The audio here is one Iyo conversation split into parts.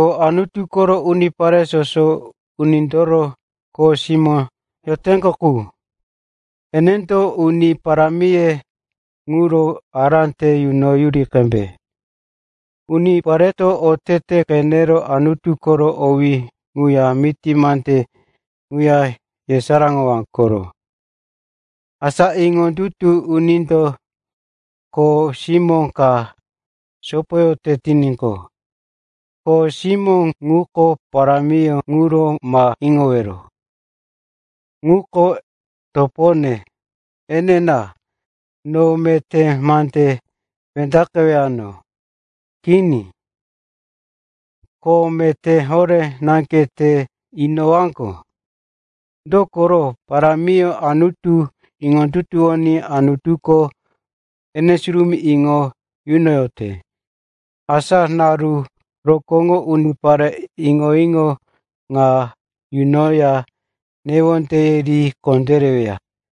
Anutu koro unipare soso unindoro kho simó yoteŋgo qu, eneŋo uni parámiye ŋuro ará te yunoyuri qembe. Unipareto oteteye qenero Anutu koro owí ŋuya miti mande ŋuya yesaráŋowaŋgo koro. Asa iŋondutu unindo kho simó ka sopoyote tiníqo, kho simó ŋuko parámiyó ŋuro ma iŋowero, “Ŋuko topone, enina, no meté mandí wendaqewano.” Kini, kho meté horé naŋge te inowaŋgo. Dokoro parámiyó Anutu iŋondutuwoní Anutuko ene surumí iŋo yunoyote. Asa naru rokóŋo unipare iŋo-iŋo ŋa yunoya newondeye ri kondéreweya.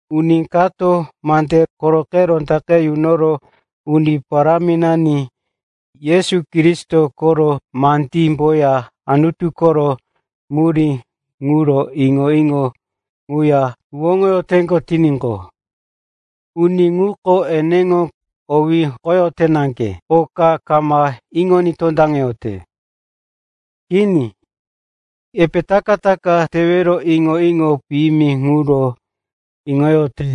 Uni kato mande koroqe rondaqe yunoro Uni Paráminani Yesu Kristo koro mandímboya Anutu koro murí ŋuro iŋo-iŋo ŋuya huwóŋoyote tiníqo, uni ŋuko eneŋo owí hokoyote naŋge, oka kama iŋoní tondaŋete. Kini. Epe taka-taka tewero iŋo-iŋo piyimi ŋuro iŋoyote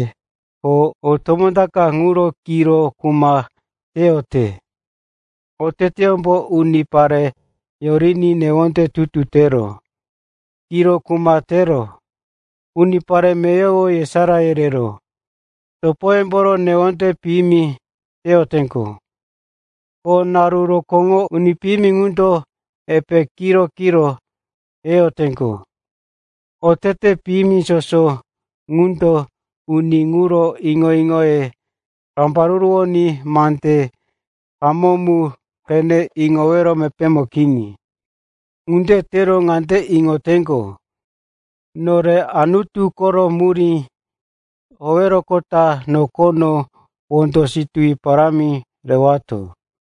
ko o tomó ta ka ŋuro kiro kuma teyote. Oteteyómbo unipare yoriní newonde tutu tero, kiro kuma tero, unipare meyowo yesará yerero, topoyemboro newonde piyimi teyoteŋgo. Ko naru rokóŋo uni piyimi ŋundo epe kiro-kiro yeyoteŋgo. Otete piyimi soso ŋundo uni ŋuro iŋo-iŋoye rambaruruwoní mande hamó mu qene iŋowero mepémo kini. Ŋunde tero ŋande iŋoyoteŋgo, “Nore Anutu koro murí howeroqota nokono wondo situwi parámi rewato.”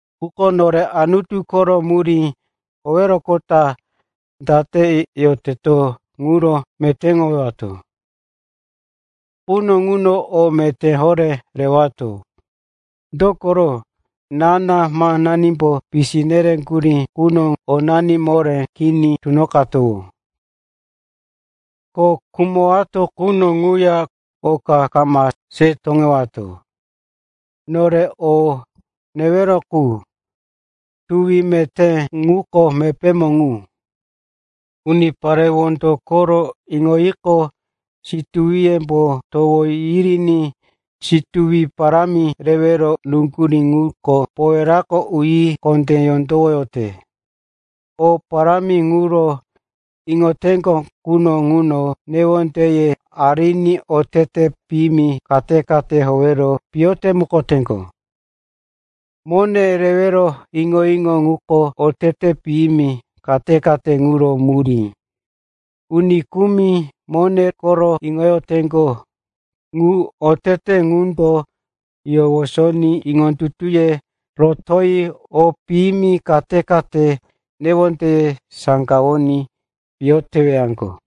Quko nore Anutu koro murí howeroqota date yoteto ŋuro metéŋowato quno ŋuno o meté horé rewato. Dokoro ná-námanimbo pisi nereŋgurí quno onani moré kini tunoqatowó. Ko khumowato quno ŋuya oka kama se toŋewato. Nore o newero qu, tuwi teyoteto, ŋuko mepémo ŋu. Unipare wondo koro iŋoyiqo, situwiyembo towo yiriní situwi parámi rewero nuŋgurí ŋuko powerako uyi kondé yondowoyote. O parámi ŋuro iŋoyoteŋgo quno ŋuno newondeye ariní otete piyimi kate-kate howero piyo temukoteŋgo. Mone rewero iŋo-iŋo ŋuko otete piyimi kate-kate ŋuro murí. Uni kumi mone koro iŋoyoteŋgo, ŋu otete ŋundo yowosoní iŋondutuye rotoyi o piyimi kate-kate newondeye saŋgawoní piyo tewaŋgo.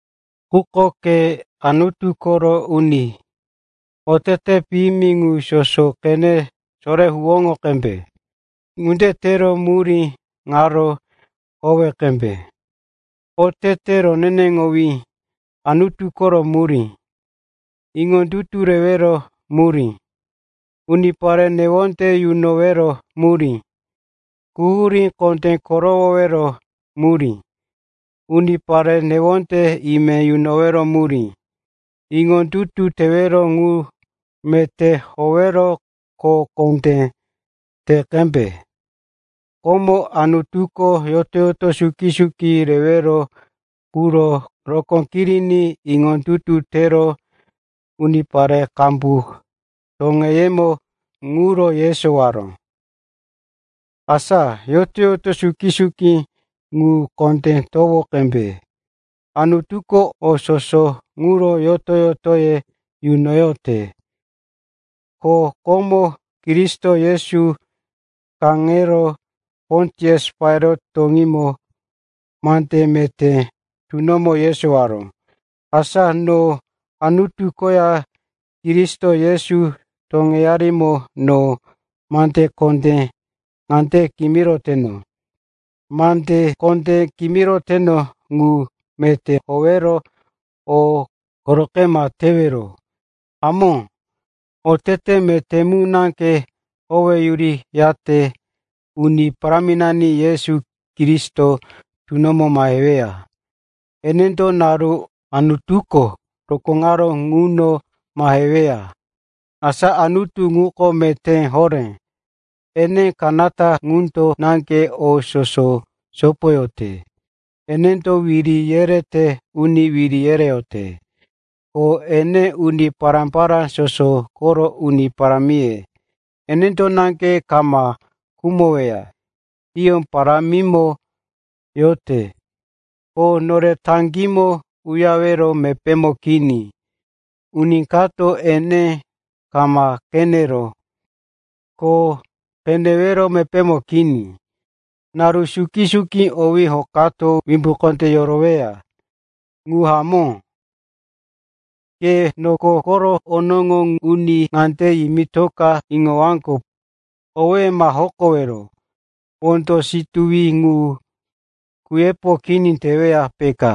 Quko ke Anutu koro uni, otete piyimi ŋu soso qene sorero huwóŋo qembe. Ŋunde tero murí ŋaro howe qembe: otete roneneŋowí, Anutu koro murí, iŋondutu rewero murí, unipare newonde yunowero murí, quhurí kondé korowowero murí, unipare newonde ime yunowero murí. Iŋondutu teyote ŋu meté howero kho kondé te qembe. Komo Anutuko yoto-yoto suki-suki rewero quro rokó kiriní iŋondutu tero unipare qambu toŋeyemo ŋuro yesowaró. Asa yoto-yoto suki-suki ŋu kondé towo qembe. Anutuko o soso quro yoto-yotoye yunoyote, ko komo Kristo Yesu kaŋero Pontius Pailat toŋímo mande meté tunomo yesowaró. Asa no Anutu koya Kristo Yesu toŋeyarimo no mande kondé ŋande kimiroteno. Mande kondé kimiroteno ŋu meté howero o koroqe ma tewero. Hamó, otete meté mu naŋge howeyuriyate Uni Paráminani Yesu Kristo tunoqe maheweya. Enendo naru Anutuko rokóŋaró ŋuno maheweya. Asa Anutu ŋuko meté horé, ene kanata ŋundo naŋge o soso sopoyote. Enendo wiri yerete uni wiri yereyote, ko ene uni pará-pará soso koro uni parámiye. Enendo naŋge kama khumoweya. Hiyó parámimo yorote, ko nore taŋgímo uyarewero mepémo kini. Uni kato ene kama qeneró, ko qenewero mepémo kini. Naru suki-suki owí hokato wimbí kondé yoroweya. Ŋu hamó. Ke noko koro onoŋo uni ŋande yimirika iŋowaŋgo, owéye ma hokowero. Wondo situwi ŋu kuyepo kini teweya, peka.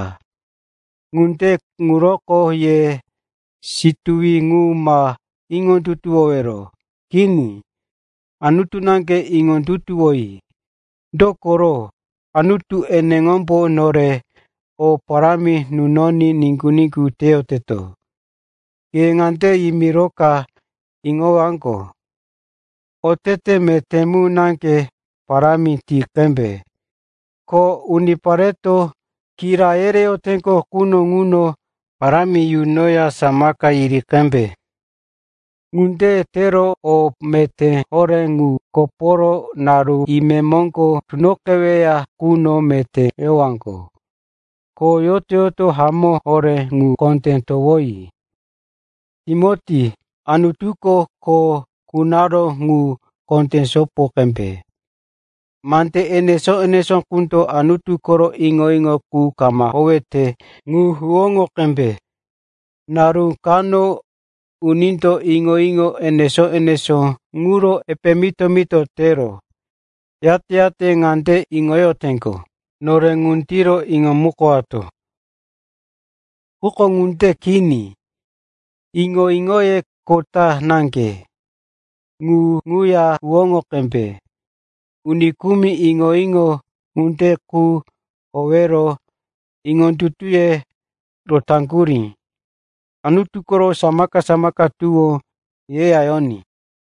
Ŋunde ŋuroko ye situwi ŋu ma iŋondutuwowero. Kini. Anutu naŋge iŋondutuwoyi, dokoro Anutu eneŋombo nore o parámi nunoní niŋgu-niŋgu teyoteto. Ke ŋande yimirika iŋowaŋgo, otete meté mu naŋge parámi ti qembe. Ko unipareto kira yereyoteŋgo quno ŋuno parámi yunoya samaka yiri qembe. Ŋunde tero o meté horé ŋu koporo naru imemoŋgo tunoqeweya quno meté yowaŋgo, ko yoto-yoto hamó horé ŋu kondé towoyi. Timoti, Anutuko kho kunaró ŋuro kondé sopo qembe. Mande enesó-enesó qundo Anutu koro iŋo-iŋo qu kama howete ŋu huwóŋo qembe. Naru kano unindo iŋo-iŋo enesó-enesó ŋuro epe mito-mito tero, yate-yate ŋande iŋoyoteŋgo, “Nore ŋundiro iŋomukowato.” Quko ŋunde kini, iŋo-iŋoye kota naŋge. Ŋu ŋuya huwóŋo qembe. Uni kumi iŋo-iŋo ŋunde qu howero iŋondutuye rotaŋgurí. Anutu koro samaka-samaka tuwó yeya yoní.